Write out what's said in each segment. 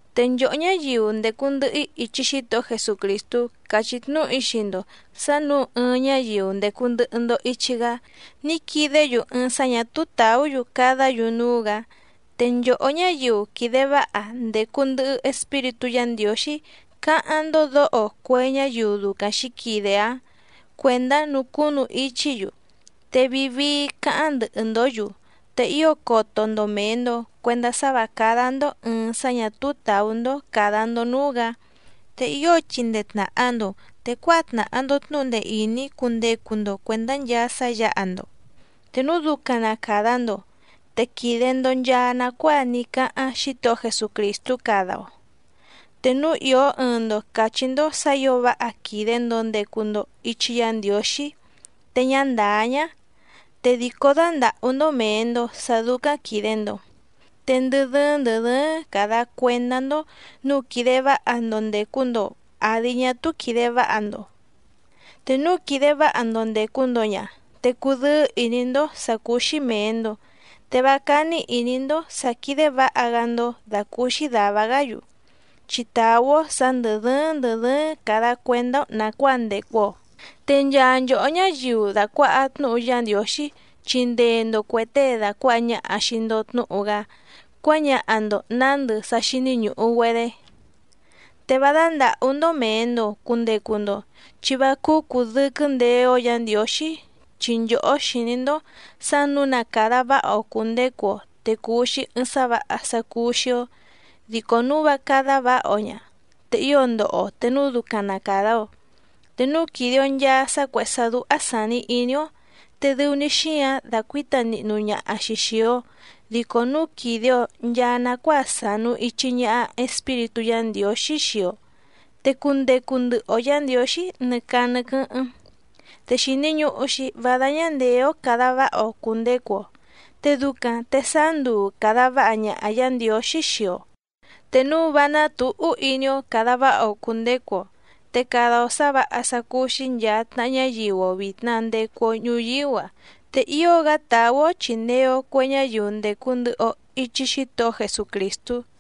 Te nchòhó ñáyiu ndècu ndɨhɨ‑í ichi Xítohó Jesucrìstú càchí tnúhu‑í xii‑ndo sǎ nǔu ɨɨⁿ ñáyiu ndècu ndɨhɨ‑ndo ichi‑gá ní quidé‑yu ɨɨⁿ sá ñà túú tàú‑yu cadá‑yu núú‑gǎ, te nchòhó ñáyiu quìde váha ndècu ndɨhɨ Espíritú Yǎ Ndiǒxí cáháⁿ‑ndó dǒho cue ñáyiu ducaⁿ xǐquide‑áⁿ cuèndá nucúnu ichí‑yu, te vii vii cáháⁿ ndɨhɨ‑ndǒ‑yu, te ío coto‑ndo mèe‑ndo cuendá sá vǎ cádá‑ndó ɨ̀ɨⁿ sá ñà túú tàú‑ndó càda‑ndo núú‑gǎ. Te ío chindee tnàha‑ndo, te cuáha tnàha‑ndo tnúhu ndee ìní cundecu‑ndo cuèndá nchaa sá yǎha‑ndo. Te núu ducaⁿ na càda‑ndo, te quìde‑ndo nchaa nacuáa ní cáháⁿ Xítohó Jesucrìstú cada‑o. Te núu ìó ɨɨⁿ‑ndo càchí‑ndó sǎ ǐo váha quìde‑ndo ndecu‑ndo ichi Yá Ndiǒxí te ñá ndàá ñá, te dìcó dándàhú‑ndó mèe‑ndo sá dúcáⁿ quìde‑ndo. Te ndɨ dɨ́ɨ́ⁿ ndɨ̀ dɨ́ɨ́ⁿ càda cuendá‑ndó nǔu quìde váha‑ndo ndècu‑ndo àdi ñá túú quìde váha‑ndo. Te núu quìde váha‑ndo ndècu‑ndo ña, te cudɨ́ɨ́ ìní‑ndó sǎ cúú‑xí mèe‑ndo, te vá cání ìní‑ndó sǎ quídé vǎha‑gá‑ndó dàcúúxí dàva‑gá‑yu. Chi tàú‑ó sǎ ndɨ̀ dɨ́ɨ́ⁿ ndɨ̀ dɨ́ɨ́ⁿ càda cuendá‑ó nàcuáa ndècu‑o. Te nchaa nchòhó ñáyiu dàcuaha tnúhu Yá Ndiǒxí chindee‑ndo cuè tée dàcuaha ñaha xii‑ndo tnúhu‑gá cuáñaha‑ndo nǎndɨ sá xíní ñùhu‑güedé. Te vá dándàhú‑ndó mèe‑ndo cundecu‑ndo, chi vá cúú cùdɨquɨ́ ndeé‑ó Yǎ Ndiǒxí, chi nchòhó xìní‑ndó sǎ nǔu na càda váha‑o cùndecu‑o, te cùu‑xi ɨɨⁿ sá vǎha sá cúú‑xí‑ó, dico núu vá cádá vǎha‑o ña, te ío ndoho‑o te núu ducaⁿ na càda‑o. Te núu quìde‑o nchaa sá cuèhé sá dúhá sàni iní‑ó, te dɨu‑ni xíǎⁿ dàcuíta nihnu ñaha‑xi xìi‑o, dico núu quìde‑o nchaa nacuáa sànu ichi ñaha Espíritú Yǎ Ndiǒxí xii‑o, te cundecu ndɨhɨ‑o Yǎ Ndiǒxí nɨ caa nɨ quɨ́hɨ́ⁿ. Te xìni ñuhu‑xi vá dáñá ndèé‑ó càda váha‑o cùndecu‑o, te ducaⁿ te sáá nduu càda váha ñaha Yǎ Ndiǒxí xii‑o, te núu vá ná tǔhú iní‑ó càda váha‑o cùndecu‑o. Te cada‑o sǎ vǎha sá cúú‑xí nchàa tnaha ñáyiu‑o vìtna ndecu‑o ñuyíú‑a, te ío‑gá tàú‑ó chìndee‑o cue ñáyiu ndècu ndɨhɨ‑o ichi Xítohó Jesucrìstú.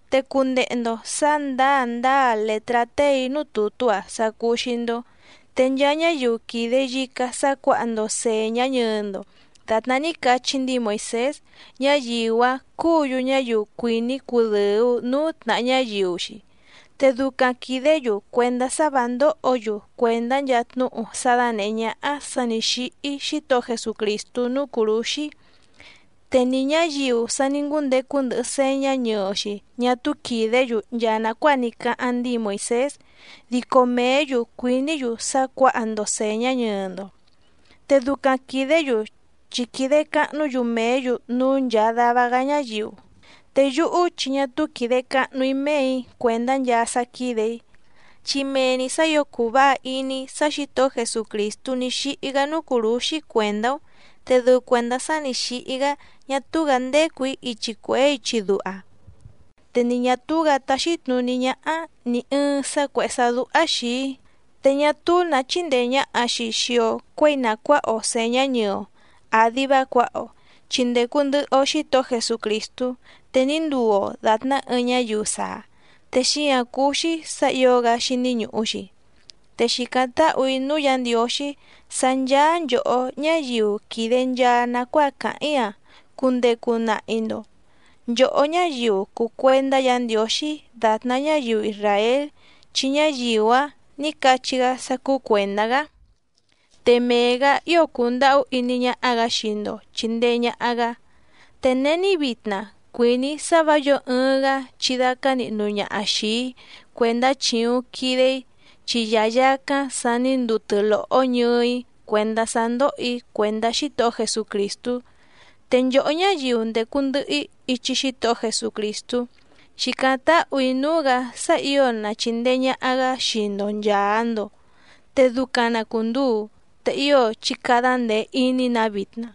Te cundehe‑ndo sǎ ndǎa ndǎa lètrá téè‑í núú tùtú‑a sá cúú‑xí‑ndó. Te nchaa ñáyiu quìde yicá sá cuǎha‑ndo sèñá ñɨɨ‑ndo dàtná ní cachí ndíi Moìsés, ñáyiu‑áⁿ cúǔ‑yu ñáyiu cuìní cudɨ̀u núú tnàha ñáyiu‑xi. Te ducaⁿ quìdé‑yu cuèndá sá vǎ ndóhǒ‑yu cuèndá nchaa tnúhu sá dánèhé ñáhá sǎ nǐ xíhí Xítohó Jesucrìstú núú cùrúxí. Te ni ñǎyiu sa ní ngúndecu ndɨhɨ sèñá ñɨɨ‑xi ñá túú quìdé‑yu nchaa nàcuáa ní cáháⁿ ndíi Moìsés, dico mèé‑yu cuìní‑yu sá cuǎha‑ndo sèñá ñɨɨ‑ndo. Te ducaⁿ quìdé‑yu chi quìde cahnú‑yu mèé‑yu núú nchàa dava‑gá ñáyiu. Te yúhú chi ñá túú quìde cahnu‑í méè‑í cuèndá nchaa sá quídè‑í, chi mee‑ni sǎ ǐo cùu váha iní‑í sá Xǐtohó Jesucrìstú ní xíhí‑gá núú cùrúxí cuèndá‑ó. Te dɨu cuèndá sá nǐ xíhí‑gá ñá túú‑gǎ ndécù‑í ichi cuèhé ichi duha, te ni ñà túú‑gǎ táxí tnùní ñáhá nì ɨɨⁿ sá cuèhé sá dúhá xìi‑í. Te ñá túú nǎ chíndèe ñaha‑xi xii‑o cuéi na cuǎha‑o sèñá ñɨɨ‑o àdi vá cuǎha‑o, chi ndècu ndɨhɨ‑o Xítohó Jesucrìstú, te ní nduu‑o dàtná ɨɨⁿ ñáyiu saa, te xíǎⁿ cúú‑xí sǎ ǐo‑gá xíní ñùhu‑xi. Te xìcáⁿ táhù‑í núú Yǎ Ndiǒxí sá ncháá nchòhó ñáyiu quìde nchaa nacuáa càháⁿ‑í‑a cundecu nahi‑ndo, nchòhó ñáyiu cùu cuendá Yǎ Ndiǒxí dàtná ñáyiu isràél chi ñáyiu‑áⁿ nǐ cachí‑gá sá cúú cuèndá‑gá. Te mee‑gǎ ío cundàhú iní ñáhá‑gǎ xii‑ndo chìndee ñaha‑gá. Te není vitna cuìní‑í sá vǎ yǒo ɨɨⁿ‑gá chidácá nihnu ñaha xìi‑í cuèndá chìuⁿ quide‑í, chi yayàcáⁿ sa ní nduu tɨ́lòhó ñɨɨ‑í cuèndá sá ndóhò‑í cuèndá Xítohó Jesucrìstú. Te nchòhó ñáyiu ndècu ndɨhɨ‑í ichi Xítohó Jesucrìstú xìcáⁿ táhù‑í núú‑gǎ sá ǐo na chìndee ñaha‑gá xii‑ndo nchàa‑ndo. Te ducaⁿ na cùnduu. Te ío chí cádá ndèe iní‑nǎ vitna.